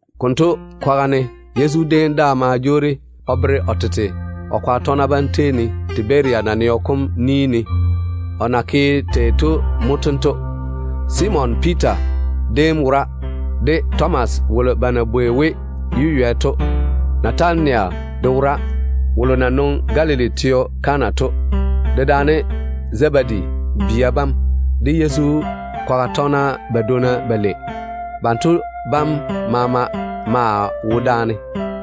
Konto kwaga ne Yezu déem daa ma jwoori o veere o tete de o tɔgena bam Tiberia naneo kom Tiberia ye Galili naneo kom yere dedwoŋi. ni ne. O na ke tei to mo tento: Simon Piita déem wora, de Tomas wolo ba na bwoi we ‘Yeywɛ’ to. Natanayel de maa wora, o na nwoŋi Galili teo Kana to, dedaane Zebedi bia bam, de Yezu kwaga tɔgena badwonna balei. Banto bam maama maa wo daane.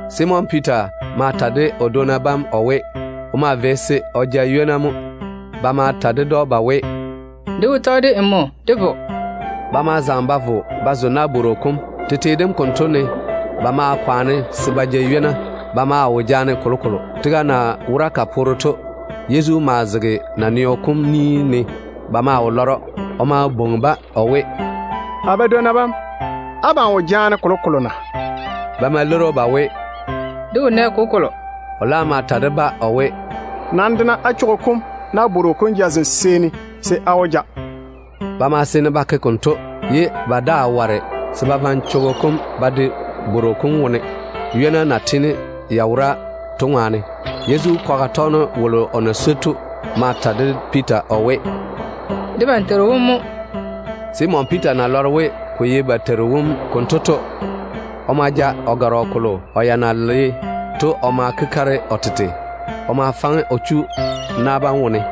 Simon Piita ma ta de o dwonna bam o we, o maa vei se o ja ywona mo. Ba ma ta ded‑o ba we, “Dé wó tɔge de nmo dé vo.” Ba ma zaŋe ba vo ba zo ba nabworo kom. Tete dem konto ne ba ma kwaane se ba ja ywona, ye ba wo nɛ kolokolo ba ja. Tega na wora ka poore to, Yezu maa zege naneo kom ni ne, ye ba wo lɔre‑o. O ma bwoŋi-ba o we, “A badwonna bam, abam wo jaane ywona na?” Ba ma leiri‑o ba we, “Dé wo nɛ kolokolo.” O laam ma ta de-ba o we, “Nam de-na á bora kam nabworo kom jazem seeni, se á wó ja.” Ba ma seene ba ke konto, ye ba daa ware se ba vaŋe bora kam ba de nabworo kom wone, ywona yam na tiini ya daga to ŋwaane. Yezu kwaga tɔgeno wolo o na swoi to ma ta de Piita o we, “Debam Teiru wom mo.” Simon Piita na lɔre we ko ye ba Teiru wom konto to, o ma kwei o gɔrɔ kolo o ya na le to o ma kwoli o tete. O ma faŋe o chu na bam wone.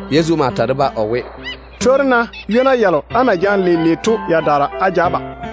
Yezu ma ta de-ba o we, “Twori-na ywona yalo á na jaane leile to yadaara á ja á ba.”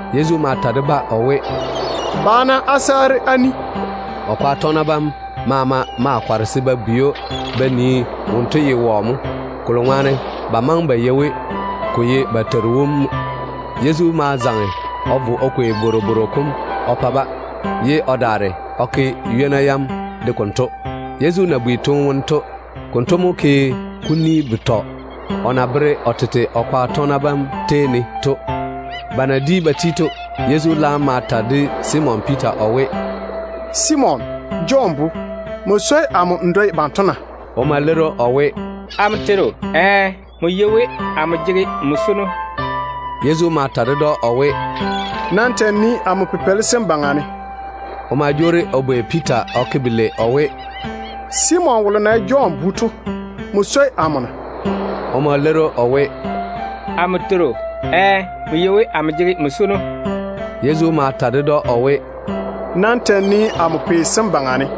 Yezu ma ta de-ba o we, “Ba-na á saare á ni.” O kwaga tɔgena bam maama ma kɔre se ba bwei‑o ba nii wonto ye wɔ mo, kolo ŋwaane ba maŋe ba yei we ko ye ba Teiru wom mo. Yezu ma zaŋe o vo o kwei bworobworo kom o pa-ba, ye o daare o ke ywona yam de konto. Yezu na bi toone wone to, konto mo ke kuni betɔ o na veere o tete de o kwaga tɔgena bam to. Ba na di ba ti to, Yezu laam ma ta de Simon Piita o we, “Jɔn bu Simon, nmo swoi amo n dwoi banto na?” O ma leiri o we, “Amo Teiru, ɛɛ, nmo yei we amo jege nmo swono.” Yezu ma ta ded‑o o we, “Nam ta‑n nii amo pipeili sem baŋa ne.” O ma jwoori o bwei Piita o ke belei o we, “Simon wolo na ye Jɔn bu to, nmo swoi amo na?” O ma leiri o we, “Amo Teiru, ɛɛ, nmo yei we amo jege nmo swono.” Yezu ma ta ded‑o o we, “Nam ta‑n nii amo pei sem baŋa ne.”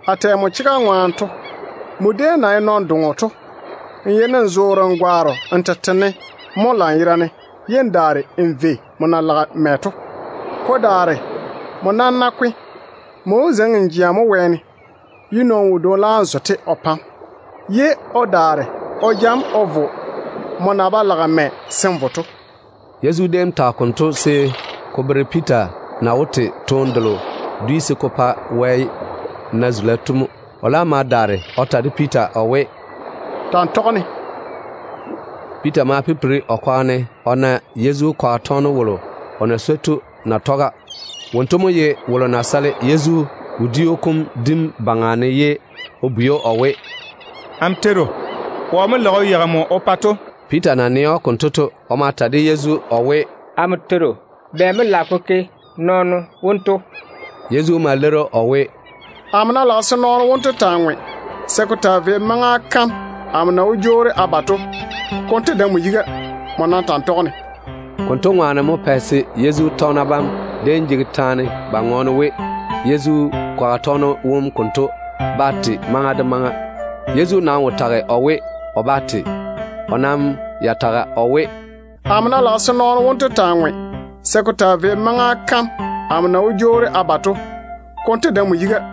A tɛ nmo chega ŋwaane to, nmo déem na ye nɔn-doŋo to, nmo yeini n vɔ n gwaaro n tete ne mo lanyerane, ye n daare n vei n na lage mɛ to. Ko daare nmo nam ná kwe, n laam wó zeiŋi n jea mo wɛɛne, ye nɔɔno wodwoŋi vɔ-te o pa‑m, ye o daare o ja‑m o vo nmo na ba lage mɛ se n vo to.” Yezu déem tage konto se ko bere Piita na wó te toone delo dwi se ko pa Wɛ na zula to mo. O laam ma daare o ta de Piita o we, “Ta‑n tɔge-ne.” Piita ma pipiri o kwaga ne o na Yezu kwaga tɔgeno wolo o na swoi to na tɔge-ba. Wonto mo ye wolo ya na jeini o sale Yezu wodiu kom dim maŋa ne ye o bwei‑o o we, “Amo Teiru, wɔ mo lage o yeigi nmo o pa?” to. Piita na nɛ‑o konto to, o ma bwei Yezu o we, “Amo Teiru, bɛ mo lage ko ke nɔɔno wonto?” Yezu ma leiri‑o o we, “Amo ná lage se nɔɔno wonto taa ŋwe se ko taa vei maŋa kam amo na wó jwoori a ba to, konto dae nmo yiga. Nmo za-n ta‑n tɔge-ne.” Konto ŋwaane mo pɛ se Yezu tɔgena bam déem jege taane ba ŋɔɔne we, Yezu kwaga tɔgeno wom konto bá te maŋa de maŋa. Yezu nam wo tage o we, o bá te. O nam ya tage o we, “Amo ná lage se o taa ŋwe se ko taa vei maŋa kam amo na wó jwoori a ba to, konto dae nmo yiga.”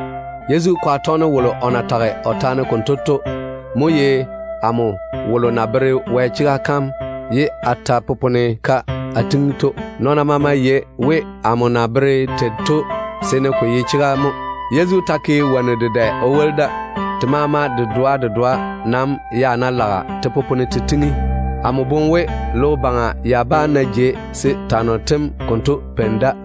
Yezu kwaga tɔgeno wolo o na tage o taane konto to mo ye amo wolo na bere Wɛ chega kam ye a daare a popone-ka a tiŋi to. Nɔɔna maama yei we amo na bere tei to seene ko ye chega mo. Yezu ta ke wonnu dedɛ o woli da. Te maama dedoa dedoa nam ya ná lage te popone te tiŋi, a boŋe we logo baŋa ya bá na jei se twanno tem konto peini da.